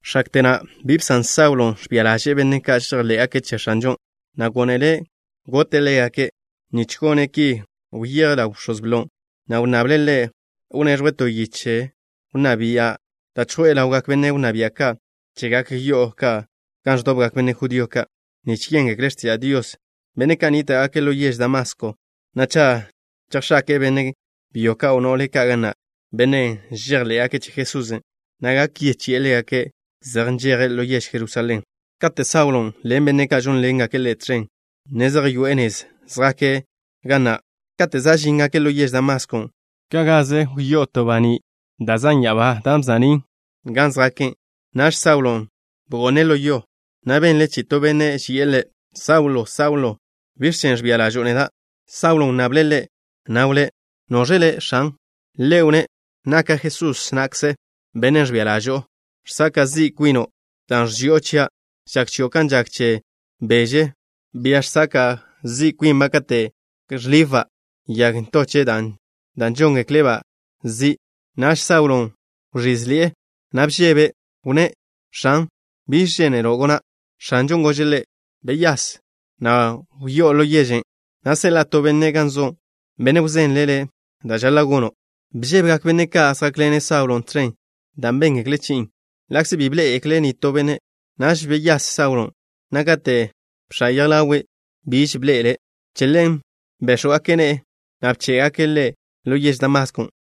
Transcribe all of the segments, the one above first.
X̱akte na' bi bsan Saulo ẕbia ḻaže'e benne' ka' žejḻé'gake' che X̱anžon', na' gónele' gote' ḻégake'. Nich gone' ki wyeje' ḻaw bx̱oz blo, na' wnnable' ḻe' gone' to yiche wnná bia' da' chjo'e ḻawgak benne' wnná bia' ka' chegak yo'o ka' gan ẕdobgak benne' judío ka' nich yéngekle' x̱tiža' Dios, benne' ka' nníta'gake' ḻo yež Damasko, na' cha' chejx̱ake'e benne' byo ka', o no'le ka' ga na', benne' žejḻé'gake' che Jesusen', na' gak yechi'e ḻégake' zej nžeje' ḻo yež Jerusalén. Kate' Saulon' ḻen benne' ka' žónḻengake' ḻe' tẕen, ne zej yoe'e nezen' zjake', na' kate' za' žíngake' ḻo yež Damaskon', ka' gaze wza'ni'ḻe'e to baní' da' zan' ya'abá, dan' wza'nín' gan zjake'. Naž Saulon' bgo'ne' ḻo yo, na' benle' chi'i to benne' ži'e ḻe': —Saulo, Saulo, ¿biẕ chen' ẕbia ḻažo'o neda'? Saulo wnnable' Ḻe', na' wnné': —¿Noẕ Le', X̱an? Ḻe' wnné': —Naka' Jesús na'kze, Bennen' ẕbia ḻažo'o. Žsaka' zi' kwino', dan' ẕži'o chia'. Žak chio' kan žak che beže, bia žsaka' zi' kwinba' kate' ẕlibba' yag ntoche' da' žóngekle'-ba' zi'. Naž Saulon' wẕízḻi'e, na' bžebe'. Wnné': —X̱an, ¿biẕ žénelo' gona'? X̱anžon' gože' ḻe': —Wyase, na' wyáz ḻo yežen', na' seḻa'a to benne' gan so', benne' wzenle' le' da' žaḻa' gono'. Bžébegak benne' ka' zjákḻene' Saulon' tẕen, dan' béngekle' chi'in', ḻa'kze bi bḻé'egekle' nitó benne'. Naž beyás Saulon', na' kate' bx̱á' yej ḻawe', bi be ẕḻe'ele'. Che ḻen béx̱wgake' ne'e, na' bché'gake' ḻe' ḻo yež Damaskon'.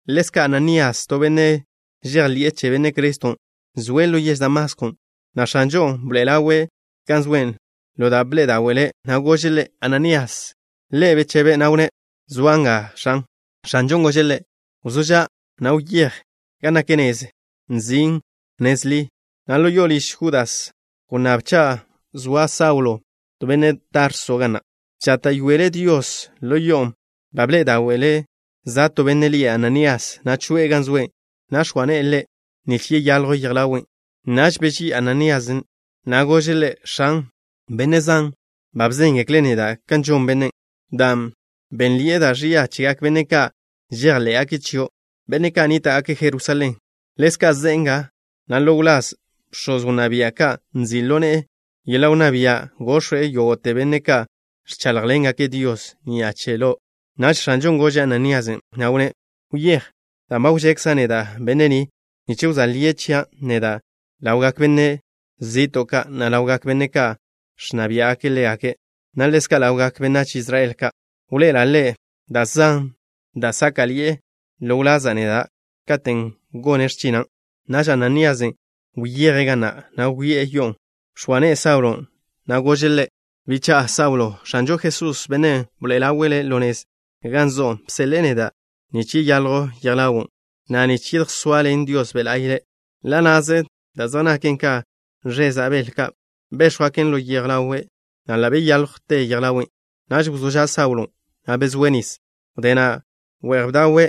Ḻezka' Ananías, to benne' žejḻi'e che Benne' Criston', zoe' ḻo yež Damaskon', na' X̱anžon' bḻoe'e ḻawe' gan zoe' ḻo da' bḻe'e dáwe'le', na' gože' ḻe': —Ananías. Ḻe' bechebe', na' wnné': —Zoa' nga, X̱an. X̱anžon' gože' ḻe': —Wzó ža', na' wyéj gan nak nezen' nzin' Nez Ḻi, na' ḻo liž Judas wnnáb cha' zoa Saulo, benne' Tarso, ga na'. Žáta'yoele' Dios ḻo yo'on'. Ba bḻe'e dáwe'le' za' to benne' lie' Ananías, na' choe'e gan zoe', na' x̱oa ne'e ḻe' nich yeyaljw yej ḻawe'. Naž beží'i Ananías na', na' gože' Ḻe': —X̱an, benne' zan ba bzéngekle' neda' kan žon bennen', dan' benḻe'e da' ẕia chegak benne' ka' žejḻé'gake' chio', benne' ka' nníta'gake' Jerusalén. Ḻezka' ze'e nga, na' ḻo wláz bx̱oz wnná bia' ka' nzi' ḻo ne'e yeḻa' wnná bia' gox̱we' yógo'te benne' ka' ẕcháḻjḻengake' Dios ni'a che Lo'. Naž X̱anžon' gože' Ananíasen', na' wnné': —Wyéj, dan' wžekza' neda' bennen' nich wzóa lie' chia' neda' ḻawgak benách zi'to' ka', na' ḻawgak benne' ka' ẕnna biá'gake' ḻégake', na' ḻezka' ḻawgak benách Israel ka'. Wḻoe'ela' ḻe' da' zan da' sáka'ḻi'e ḻo wlaza' neda', katen' gone' x̱china'. Naž Ananíasen' wyeje' ga na', na' wyoé'e yo'on'. Bx̱oa ne'e Saulon', na' gože' ḻe': —Bicha'a Saulo, X̱anžo Jesús, Bennen' bḻoe'e ḻawe' ḻo nez gan zo'o, bseḻe'e neda' nich yeyaljw yej ḻawo', na' nich yedjsoaḻen Dios Be' La'y le'. Ḻa' na'ze da' zej naken ka ẕeza' bel ka' béx̱jwgaken ḻo yej ḻawe', na' ḻa' beyáljwte yej ḻawe'. Naž wzó ža' Saulon', na' bezóe' nis. Wdé na' we'j bdawe',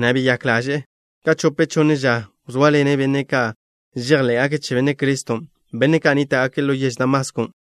na' beyák ḻaže'e. Ka chope chonne ža wzóaḻene' benne' ka' žejḻé'gake' che Benne' Criston', benne' ka' nníta'gake' ḻo yež Damasko.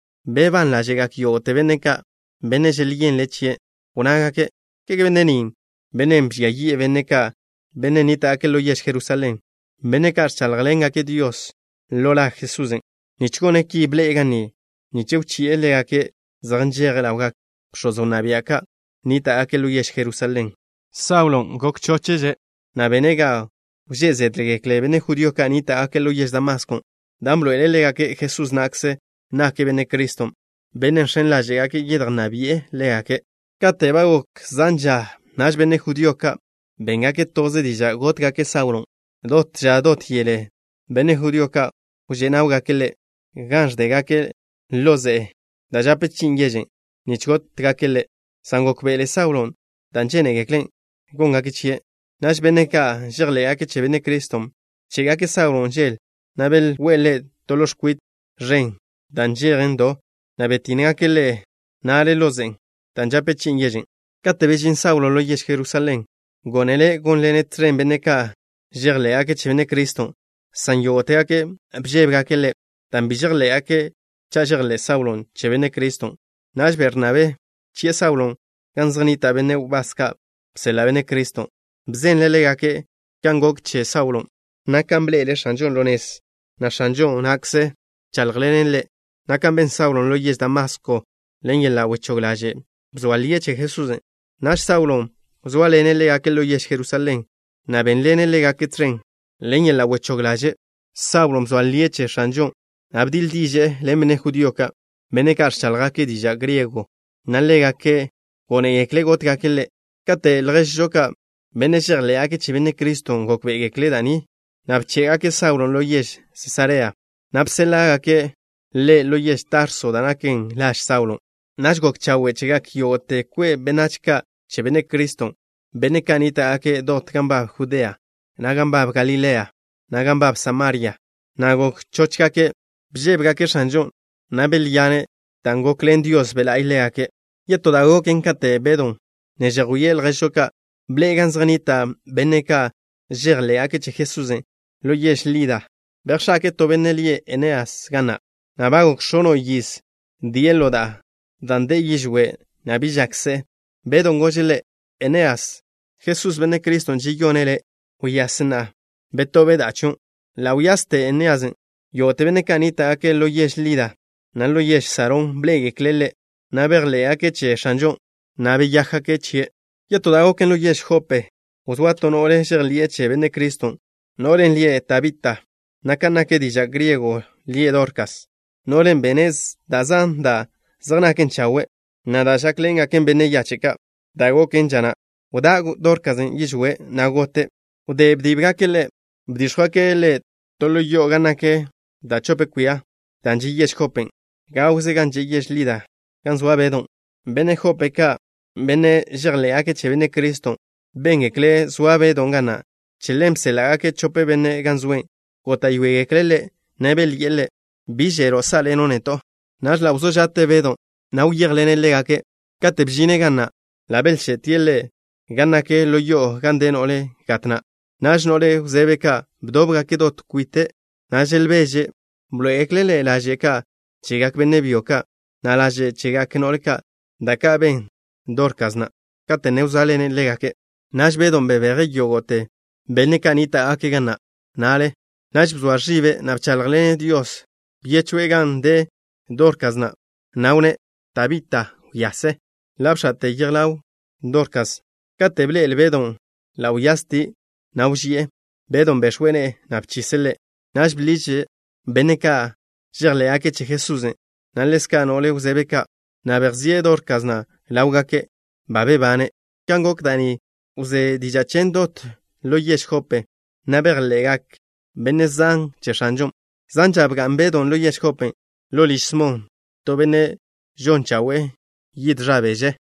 Bebán ḻáže'gak yógo'te benne' ka', benne' želyenle' chie', na' wnnágake': —¿Kege benne' ni bennen' bžia yi'e benne' ka' nníta'gake' ḻo yež Jerusalén, benne' ka' ẕcháḻjḻengake' Dios ḻo la Jesusen'? Nich gone' ki bḻe'e ga ni, nich wchi'e ḻégake' zej nžeje' ḻawgak bx̱oz wnná bia' ka' nníta'gake' ḻo yež Jerusalén. Saulon' gok chochže', na' bene' ga wžé' zédgekle benne' judío ka' nníta'gake' ḻo yež Damasko, dan' bḻoe'ele' ḻégake' Jesús na'kze nake' Benne' Criston', Bennen' žx̱en ḻáže'gake' yedjnná bi'e ḻégake'. Kate' ba gok zan ža, naž benne' judío ka' béngake' toze diža' gótgake' Saulon'. Dot ža dot yele benne' judío ka' wžé' náwgake' ḻe' gan ẕdégake' ḻo ze'e da' žape chi'in yežen', nich gótgake' ḻe', san gókbe'ele Saulon' da' žénegekle' góngake' chie'. Naž benne' ka' žejḻé'gake' che Benne' Criston' bché'gake' Saulon' žel, na' belwé'e ḻe' to ḻo x̱kwit ẕen da' nžejen do, na' btínnegake' ḻe' na'le ḻo ze'en' dan' žape chi'in yežen'. Kate' bežín Saulo ḻo yež Jerusalén, gónele' gónḻene' tẕen benne' ka' žejḻé'gake' che Benne' Criston', san yógo'tegake' bžébegake' ḻe', dan' bi žejḻé'gake' žejḻé' Saulon' che Benne' Criston'. Naž Bernabé bchi'e Saulon' gan zej nnita' benne' wbás ka' bseḻa' Benne' Criston'. Bzenle' ḻégake' kan gok che Saulon', na' kan bḻe'ele' X̱anžon' ḻo nez, na' X̱anžo na'kze bcháḻjḻene' ḻe', na' kan ben Saulon' ḻo yež Damasko, ḻen yeḻa' wechóg ḻaže' bzoa lie' che Jesusen'. Naž Saulon' wzóaḻene' ḻégake' ḻo yež Jerusalén, na' bénḻene' ḻégake' tẕen. Ḻen yeḻa' wechóg ḻaže' Saulon' bzoa lie' che X̱anžon', na' bdiḻ diže'e ḻen benne' judío ka', benne' ka' ẕcháḻjgake' diža' griego, na' ḻégake' gónegekle' gótgake' ḻe'. Kate' lježžo ka', benne' žejḻé'gake' che Benne' Criston' gókbe'egekle' da' ni, na' bché'gake' Saulon' ḻo yež Sesarea, na' bséḻa'gake' ḻe' ḻo yež Tarso, da' naken laž Saulon'. Naž gok chawe' chegak yógo'te kwe' benách ka' che Benne' Criston', benne' ka' nníta'gake' dot gan nbab Judea, na' gan nbab Galilea, na' gan nbab Samaria, na' gok chóchgake'. Bžébegake' X̱anžon', na' belyane' dan' gokḻen Dios Be' La'y ḻégake'. Yetó da' goken, kate' Bedw ne žejwíe' lježžo ka', bḻe'e gan zej nnita' benne' ka' žejḻé'gake' che Jesusen' ḻo yež Lida. Bejx̱ake'e to benne' lie' Eneas ga na', na' ba gok x̱ono' yiz die' ḻo da'a dan' de'e yižwé', na' bi žak se'e. Bedon' gože' ḻe': —Eneas, Jesús, Benne' Criston', žeyone' le'. Wyase, na' betób da'a chion'. Ḻa' wyaste Enéasen'. Yógo'te benne' ka' nníta'gake' ḻo yež Lida, na' ḻo yež Sarón, bḻé'egekle' ḻe', na' bejḻé'gake' che X̱anžon', na' beyákgake' chie'. Yetó da' goken, ḻo yež Jope wzóa to no'le žejḻi'e che Benne' Criston', no'len' lie' Tabita, na' kan nak diža' griego lie' Dorkas. No'len' bene' zan da' zej naken chawe', na' da' žákḻengaken benne' yache' ka'. Da' goken ža na', wdá' Dorkasen' yižwé', na' gote'. Wdé bdíbgake' ḻe', bdíx̱jwgake' ḻe' to ḻo yo'o gan nak da' chope kwia. Dan' že' yež Jopen' gawze gan že' yež Lida gan zoa Bedon', benne' Jope ka', benne' žejḻé'gake' che Benne' Criston', béngekle' zoa Bedon' ga na'. Che ḻen bséḻa'gake' chope benne' gan zoe'. Góta'yoegekle' ḻe', na' belyi'e ḻe': —Bi želo' sá'ḻeno' neto'. Naž ḻa' wzó ža'te Bedon', na' wyéjḻene' ḻégake'. Katen' bžine' ga na', ḻa' belche'tie' ḻe' gan nak ḻo yo'o gan de no'le gat na'. Naž no'le wzebe ka' bdóbgake' dot kwite', na' želbeže'. Bḻoé'egekle' ḻe' laže' ka' chegak benne' byo ka', na' laže' chegak no'le ka', da' ka' ben Dorkasen' kate' ne wzóaḻene' ḻégake'. Naž Bedon' bebeje' yógo'te benne' ka' nníta'gake' ga na' na'le. Naž bzoa ẕibe', na' bcháḻjḻene' Dios. Byechje' gan de Dorkasen', na' wnné': —Tabita, wyase. Ḻa' bx̱a'te yej ḻaw Dorkasen'. Kate' bḻe'ele' Bedon', ḻa' wyastie', na' wži'e. Bedon' bex̱we' ne'e, na' bchise' ḻe'. Naž bḻiže' benne' ka' žejḻé'gake' che Jesusen', na' ḻezka' no'le wzebe ka', na' bejzíe' Dorkasen' ḻáwgake', ba bebane'. Kan gok da' ni wzé diža' chen dot ḻo yež Jope, na' bejḻe'gak benne' zan che X̱anžon'. Zan ža bga'n Bedon' ḻo yež Jopen' ḻo liž Smon, to benne' žon chawe'e yid ẕa beže.